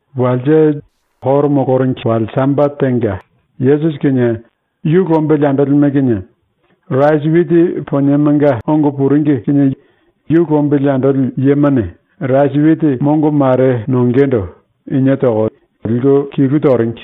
Walse, ⸤Juda yambomanga koro moloringi⸥ wale Sambate tenga, Yesusi kinie yu lombili andolime kinie rasi witi poniemanga ongo puringi kinie yu lombili andoli yemane rasi witi mongo mare nongendo inie toko liku kilu toringi.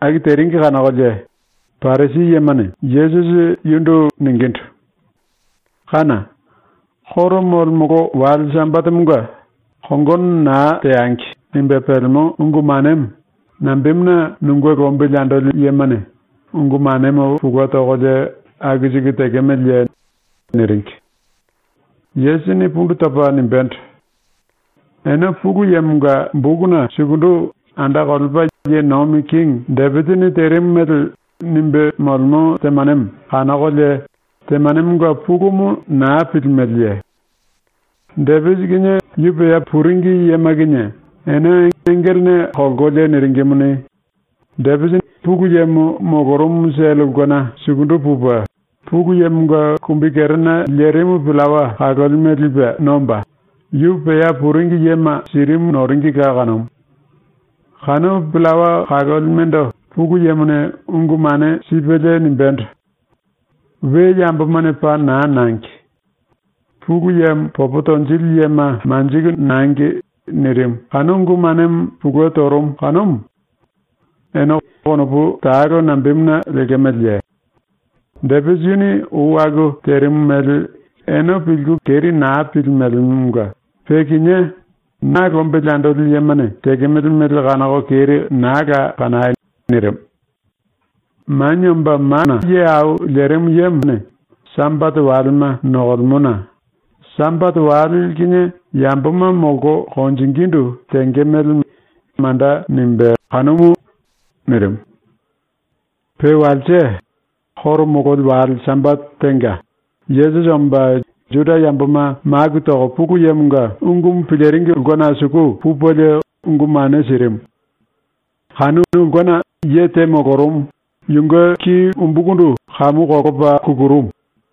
Aku teringi kanokolie Parisi yemane Yesusi yundu ningindu: “Kána! ⸤Koro molemolo⸥ wale Sambatemonga ‘Kongono naa teangi.’ nimbe pelemo ungu manemo nambemuna nunge lombili andoli yemane ungu manemo pulue tokolie aku siku tekemeleye?” niringi. Yesusini pundu topa nimbendo: “Ene Pulu Yemonga bokuna sukundu ⸤anda kolepa ye nomi kingi⸥ Depisini terimu mele nimbe molemo temanemo kanokolie temanemonga pulumu naa pilimeleye? Depisi kinie yu pea puringi yema kinie ene engelene kolkolie niringimuni, Depisi Pulu Yemo molorumu sele ulkena sukundu pupe, Pulu Yemonga kumbikerena lerimu pillawa kalolime lipe nomba, yu pea puringi yema sirimu noringila kanumu. Kanu pillawa kalolimendo Pulu Yemone ungu mane sipelie nimbendo: “We yambomane paa naa nangi. Pulu Yemo popo tonjili yema manjiku nangi.” nirimu ⸤kanu ungu manemo pulue torumu⸥ kanumu. ⸤Ene konopu talo nambemuna lemeleye? Depisi yuni ou aku terimu mele ene pilku keri naa pilimelemonga pe kinié na lombili andoli yemane tekemele mele kanoko keri naa la kanai.⸥” nirimu. “Manie Omba Mana Ye Au Lerimu Yemone Sambate walema nokolemona ⸤Sambate wale kinie yamboma molko konjingindu tenge mele manda nimbé kanumu⸥.” nirimu. Pe walse, koro mololi wale Sambate tenga, Yesusi omba Juda yamboma maku toko Pulu Yemonga ungumu piliringi ulkena suku pupelie ungu mane sirimu. Kanu ulkena ye te molorumu, yunge ki umbukundu kamu kolopa kukurumu.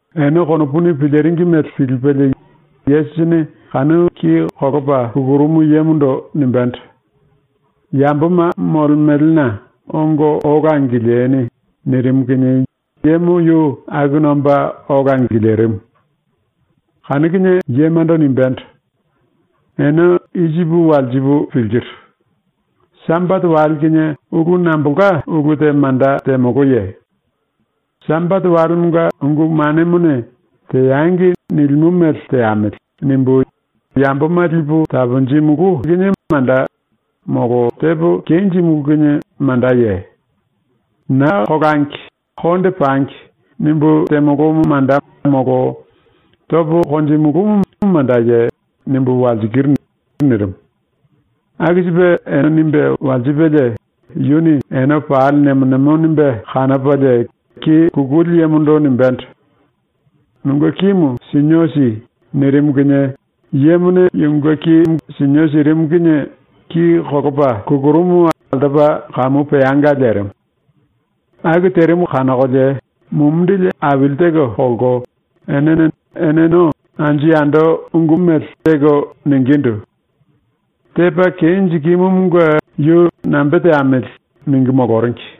Ene konopuni piliringi mele pilipelie Yesusini kanu ki kolopa kukurumu yemondo nimbendo: “Yamboma molemelena ongo ola angilieni.” nirimu kinie yemo yu akuna omba ola angilirimu. Kanu kinie yemando nimbendo: “Ene i sipu walsipu pilkiru. ‘Sambate wale kinie ulu nambolka ulu te manda temoloye? ‘Sambate walemonga ungu manemone “Teangi.” nilimo mele teamili.’ nimbu yamboma lipu taponjimulú kinie manda molo tepo kenjimulú kinie mandaye? ‘Naa kolangi. Konde pangi.’ nimbu temolomo manda molo topo konjimulúmu mandaye?’ nimbu walsikiru.” nirimu. Aku sipe ene nimbe walsipelie yuni ene pali nemo nemo nimbe kanopalie ki kukuli yemondo nimbendo: “Nunge kimu sinio si.” nirimu kinie yemone yunge ki sinio sirimu kinie ki kolopa kukurumumu altopa kamu peanga lerimu. Aku terimu kanokolie mumindili aili teko kolko enene eneno anju yando ungu mele teko ningindu: “Tepa kenjikimumunge yu nambe teamiliye?” ningu moloringi.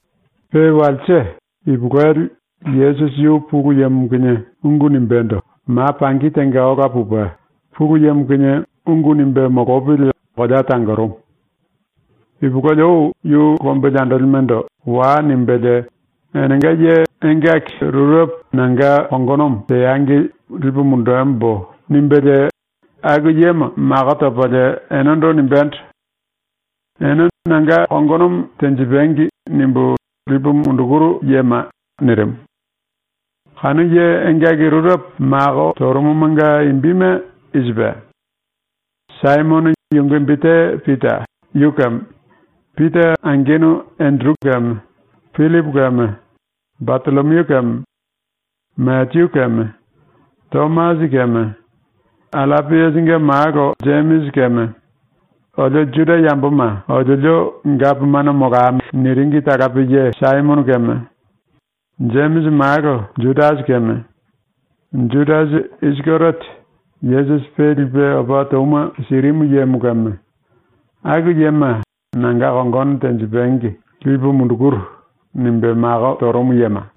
Pe walse ipulueli Yesusi yu Pulu Yemo kinie ungu nimbendo ma pangi tenga ola pupe Pulu Yemo kinie ungu nimbe molopili kolea tangorumu. Ipulueli ou yu lombili andolimendo “Wai.” nimbelie ‘Enenga ye engaki rurepo nanga kongonomo teangi lipu mundembo.’ nimbelie aku yema mako topalie enendo nimbendo: “Ene ‘Nanga kongonomo tenjipangi.’ nimbu lipu mundukuru yema.” nirimu. ⸤Kanu ye engaki rurepo mako torumumanga imbime i sipe:⸥ Saimono (yunge imbi te Pita) yu keme, Pita angenu Enderu keme, Jemisi keme, Jono keme, Pillipu keme, Batollomiu keme, Mateyu keme, Tomasi keme, Allapiasinge malo Jemisi keme, “Olio Juda yamboma oliolio gapomano molamili.” niringi talape ye Saimono keme, Jemisi malo Judasi keme, Judasi Isikeriote, Yesusi pe lipe opa touma sirimu yemo keme, ⸤aku yema ‘nanga kongono tenjipangi lipu mundukuru.’ nimbe mako torumu yema⸥.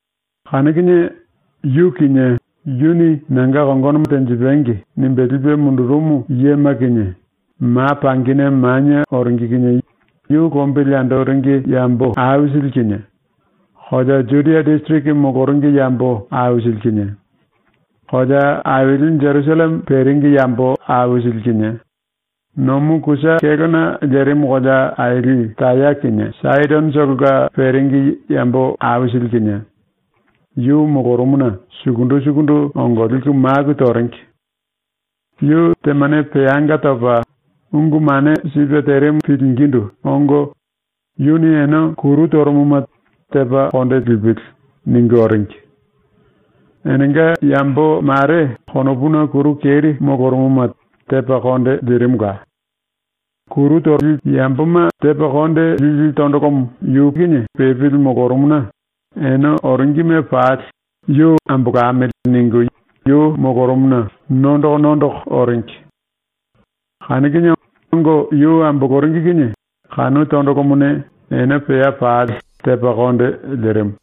Kanu kinie yu kinie, yuni “Nanga kongonomo tenjipangi.” nimbe lipe mundurumu yema kinie, ma pangine manie oringi kinie yu lombili andoringi yambo aisili kinie, kolea Judia disiriki moloringi yambo aisili kinie, kolea aili Jerusalleme peringi yambo aisili kinie, nomu kusa kélona lerimu kolea aili Taya kinie Saidonotolonga peringi yambo aisili kinie, yu molorumuna sukundu sukundu ongo liku maku toringi. Yu temane peanga topa, ungu mane sipe terimu pilingindu ongo, yuni ene kuru torumuma ‘Tepa konde lipili.’ ningu oringi. Enenga yambo mare konopuna kuru keri molorumuma tepa konde lirimula. Yamboma tepa konde lili tondolomo yu pepili molorumuna ene oringime pali ‘Yu ambolamili.’ ningu yu molorumuna nondoko nondoko oringi. Kanu kinie ongo yu amboloringi kinie kanu tondolomone ene pea pali tepa konde lirimu.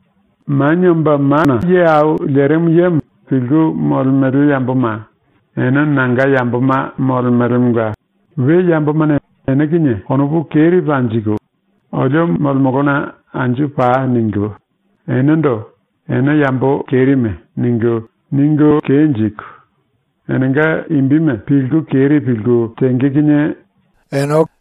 Manie Omba Mana Ye Au Lerimu Yemo pilku molemele yamboma, ene nanga yamboma molemelemonga we yambomane ene kinie konopu keri panjiku, “Olio molemolona anju pai.” ningu, enendo “Ene yambo kerime.” ningu, ningu kenjiku, enenga imbime pilku keri pilku tenge kinie ene malo.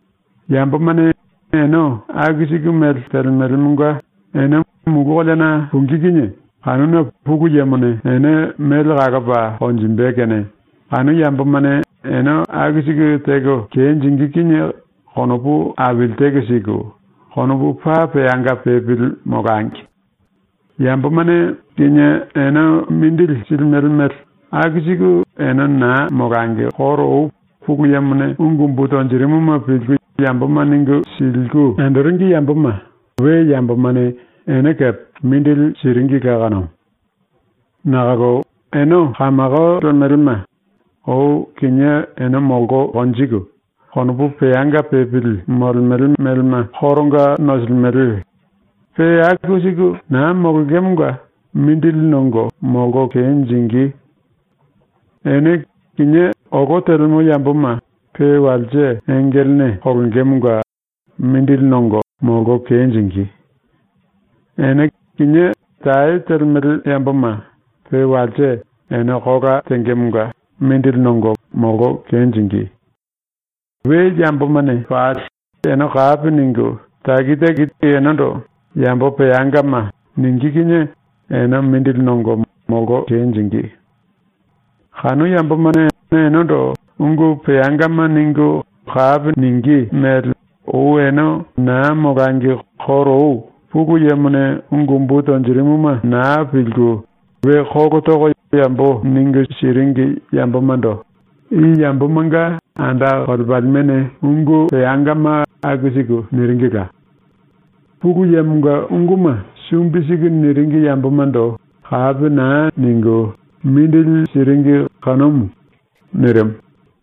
“⸤Yambomane ene aku siku mele telemelemonga⸥ ene mulu koleana pungí kinie kanuna ⸤Pulu Yemone⸥ ene mele kalopa konjimbe kene ⸤kanu yambomane ene aku siku teko kenjingí⸥ kinie konopu aili teko siku, konopu paa peanga pepili molangi. Yambomane kinié ene mindili silimele mele, aku siku ene naa molangi koro ou Pulu Yemone ungu umbu tonjirimuma pilku yamboma ningu siliku andoringi yamboma we yambomane ene kepe mindili siringila kanumu. “Nakolo ene kamako lemelema, ou kinié ene molko konjiku konopu peanga pepili molemele melema koronga nosilimele, pe aku siku naa molongemonga mindili nongo molko kenjingí. Ene kinié olo telemo yamboma pe walse engelene kolongemonga mindili nongo molko kenjingí. Ene kinié tae telemele yamboma pe walse ene kola tengemonga mindili nongo molko kenjingí. We yambomane pali ene kapi ningu taki taki enendo “Yambo peangama.” ningí kinie ene mindili nongo molko kenjingí. Kanu yambomane enendo ungu peangama ningu kapi ningí mele ou ene naa molangi koro ou Pulu Yemone ungu umbu tonjirimuma naa pilku we kolo toko yambo ningu siringi yambomando i yambomanga anda kolepalimene ungu peangama aku siku niringila. Pulu Yemonga unguma sumbi siku niringi yambomando kapi naa ningu mindili siringi kanumu.⸥” ⸤nirimu.⸥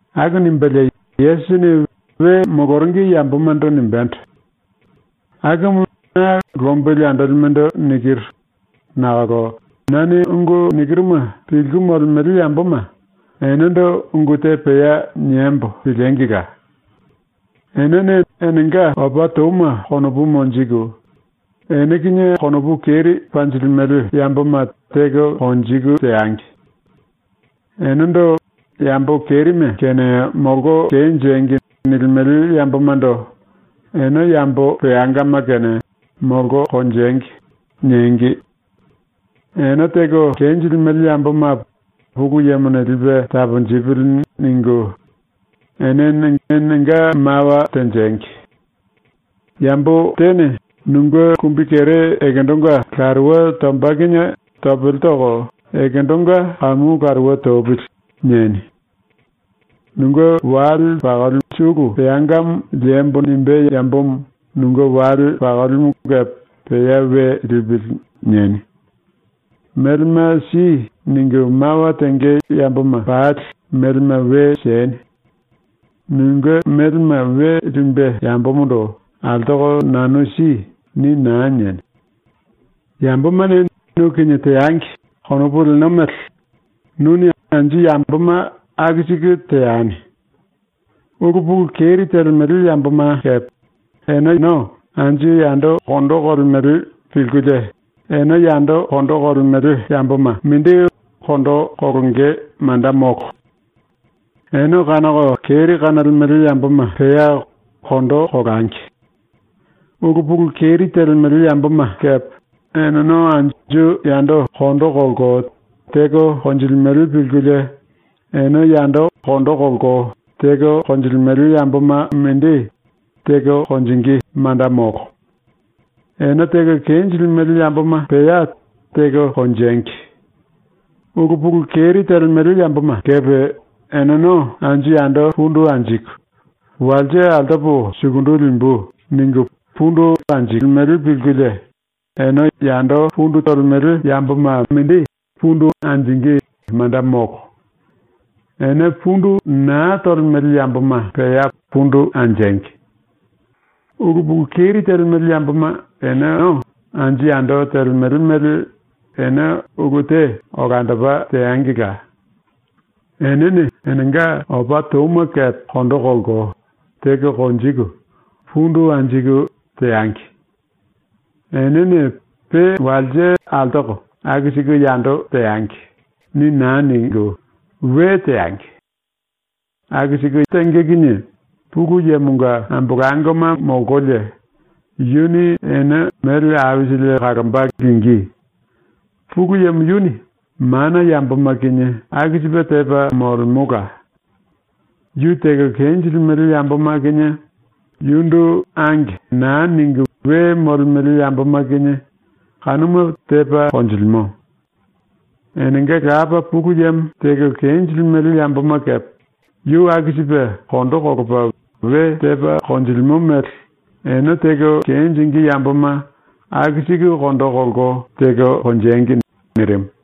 ⸤Aku nimbelie Yesusini we moloringi yambomando nimbendo:⸥ “⸤Akumu na lombili andolimendo nikiru⸥ nakolo nane ungu nikiruma pilku molemele yamboma, enendo ungu te pea niembo piliengila! Enene enenga opa touma konopu monjiku, ene kinie konopu keri panjilimele yamboma teko konjiku teangi. Enendo ‘Yambo kerime kene molko kenjengi!’ nilimele yambomando ‘Ene yambo peangama kene molko konjengi.’ niengi. Ene teko kenjilimele yamboma ‘Pulu Yemone lipe taponjipili.’ ningu enene enenga mawa tenjengi. “Yambo tene nunge kumbikere ekendonga laruwe tomba kinie topele toko ‘ekendonga kamu laruwe topili.’ nieni. ‘Nunge wale sulu peangamo liembo.’ nimbé yambomo nunge wale pakolimu kepe ‘pea we lipili.’ nieni. “Melema si.” ningu mawa tenge yamboma pali melema we sieni. Nunge melema we limbe yambomondo “Altoko nanu si.” ni naa nieni. “‘Yambomane nu kinie teangi.’ konopu leno mele, nuni anju yamboma aku siku teani. “Ulu pulu keri telemele yamboma kepe eneno anju yando kondo kolemele pilkulie ene yando kondo kolemele yamboma mindi kondo kolonge manda molo. Ene kanoko keri kanolemele yamboma pea kondo kolangi. Ulu pulu keri telemele yamboma kepe eneno anju yando kondo kolko teko konjilimele pilkulie ene yando kondo kolko teko konjilimele yamboma mindi teko konjingí manda molo. Ene teko kenjilimele yamboma pea teko konjengi. Ulu pulu keri telemele yamboma kepe eneno anju yando pundu anjiku, ‘Walse altopo sukundu limbu’ ningu pundu anjilimele pilkulie, ene yando pundu tolemele yamboma mindi pundu anjingí manda molo. Ene pundu naa tolemele yamboma pea pundu anjengi. “⸤Ulu pulu keri telemele yamboma eneno anju yando telemele mele ene ulu te olandopa teangila.⸥ Enene enenga opa touma kepe kondo kolko, teko konjiku, pundu anjiku, teangi. ‘Enene pe walse altoko aku siku yando teangi.’ ni naa ningu, we teangi. Aku siku tenge kinie Pulu Yemonga ambolangoma molkolie, yuni ene mele aisili kalomba lingí. Pulu Yemo yuni mana yamboma kinie aku sipe tepa molemola. Yu teko kenjilimele yamboma kinie, yundu ‘Ange.’ naa ningu we molemele yamboma kinie kanuma tepa konjilimo. Enenga Lapa Pulu Yemo teko kenjilimele yamboma kepe yu aku sipe kondo kolopa we tepa konjilimo mele ene teko kenjingí yamboma aku siku kondo kolko teko konjengi.” ⸤nirimu⸥.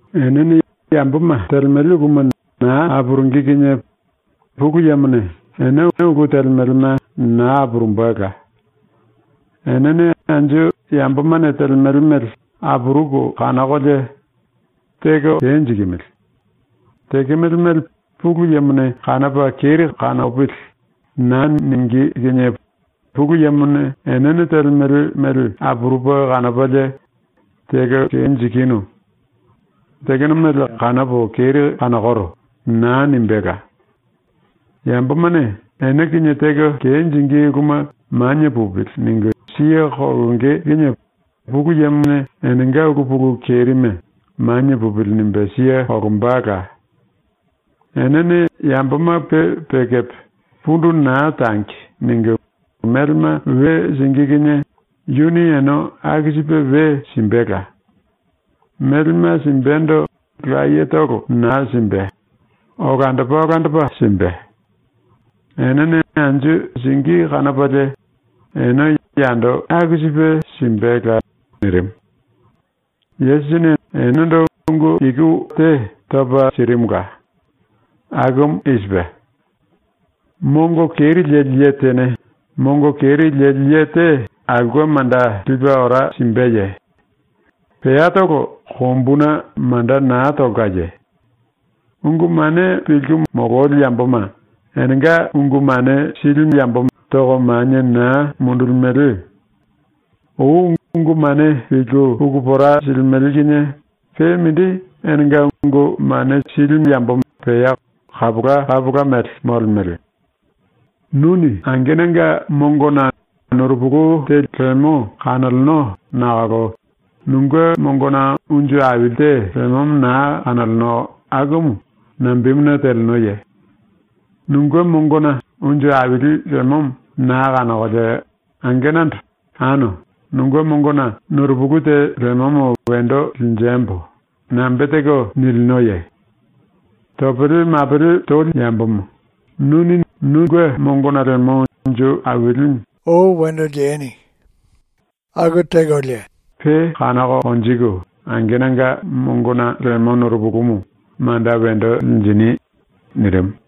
“Enene yamboma telemele uluma naa apurungí kinie ⸤Pulu Yemone⸥ ene ulu telemelema naa apurumbela. Enene anju yambomane telemele mele apuruku kanokolie “Teko kenjikimili. Tekemele mele ⸤Pulu Yemone⸥ kanopa keri kanopili.” naa ningí kinie ⸤Pulu Yemone⸥ enene telemele mele apurupe kanopalie “Teko kenjikinu. Tekeno mele kanopo keri kanokoro.” naa nimbéla. Yambomane ene kinie teko kenjingí uluma ‘Manie pupili.’ ningu siye kolonge kinie ⸤Pulu Yemone⸥ enenga ulu pulu kerime ‘Manie pupili.’ nimbe siye kolombala. Enene yamboma pe pe kepe ‘Pundu naa tangi.’ ningu melema we singí kinie yuni ene aku sipe we simbela. Melema simbendo layetolo naa simbe; olandopa olandopa simbe. Enene anju singí kanopalie ene yando aku sipe simbela.” nirimu. Yesusini enendo ungu iku wallo te topa sirimula. Akumu i sipe: “Mongo keri leli ye tene mongo keri leli ye te aulke manda lipe ora simbeye? Peatolo kombuna manda naa tolkaye? Ungu mane pilku mololi yamboma enenga ungu mane silimu toko manie naa mundulimele. Ou ungu mane pilku puku pora silimele kinie pe mindi enenga ungu mane silimu pea kapola kapola mele molemele. “Nuni angenanga mongona nurupulu te lemo kanoleno nakolo nunge mongona unju aili te lemomo naa kanoleno akumu nambemuna telenoye? Nunge mongona unju aili lemomo naa kanokolie angenando “Ano, nunge mongona nurupulu te lemomo wendo linjembo.” nambe teko nilinoye? Topele mapele toli yambomo, nuni nunge mongona lemo unju ailimu ou wendo likulie pe kanoko konjiku angenanga mongona lemo nurupulumu manda wendo linjini.” ⸤nirimu.⸥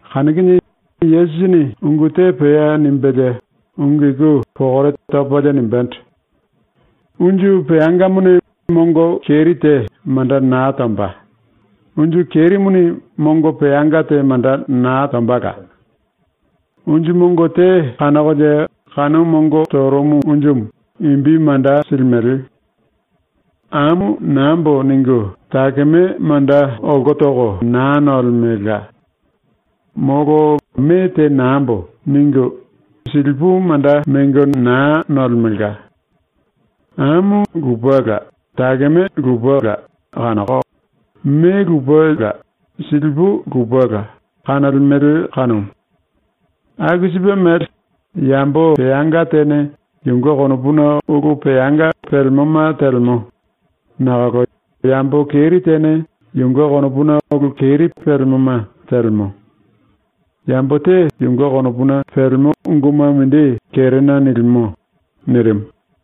⸤Kanu kinie Yesusini ungu te pea nimbelie ungu iku pokore topalie nimbendo:⸥ “Unju peangamone mongo keri te manda naa tomba; unju kerimuni mongo peanga te manda naa tombala. Unju mongo te kanokolie kanu mongo torumu unjumu imbi manda silimele. ‘Amu nambo.’ ningu, takeme manda olko toko naa nolemelka. Molo ‘Me te nambo.’ ningu, silipu manda mengo naa nolemelka. Amu lupela takeme lupela kanoko, me lupela silipu lupela kanolemele kanumu. Aku sipe mele, yambo peanga tene yunge konopuna ulu peanga pelemoma telemo, nakolo yambo keri tene yunge konopuna ulu keri pelemoma telemo. Yambo te yunge konopuna pelemo unguma mindi kerena nilimo.” ⸤nirimu.⸥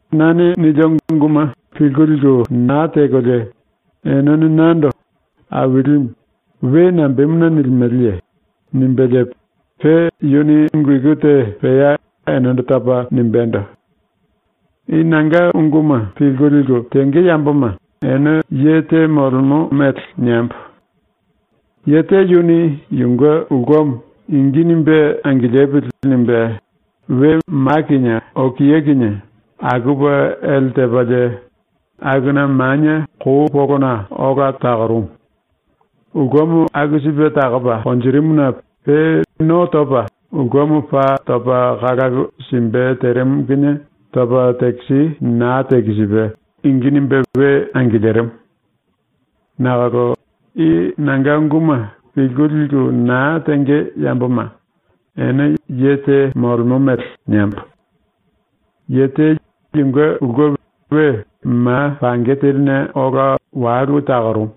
“Nane nilio unguma pilku liku naa tekolie enene nando “Ailimu” we nambemuna nilimeleye?” ⸤nimbelie pe yuni ungu iku te pea enendo topa nimbéndo:⸥ “I nanga unguma pilku liku tenge yamboma ene ye te molemo mele niembo: Ye te yuni yunge ulkemo ‘Ingi nimbe angilipili.’ nimbe we ma kinie okia kinie akupe ele tepalie, akuna manie kou polona ola takorumu. Ulkemo aku sipe takopa konjirimuna pe no topa ulkemo paa topa kalalu simbe terimu kinie topa tekisi naa tekisipe ingi nimbe we angilirimu. “Nakolo i nanga unguma pilku liku naa tenge yamboma ene ye te molemo mele niembo: Ye te yunge ulke we ma pange teline ola walu takorumu.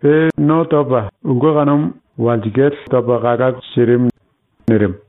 Pe no topa ulke kanumu topalie ulkemo walsikale kamu topa kalalu sirimu.” nirimu.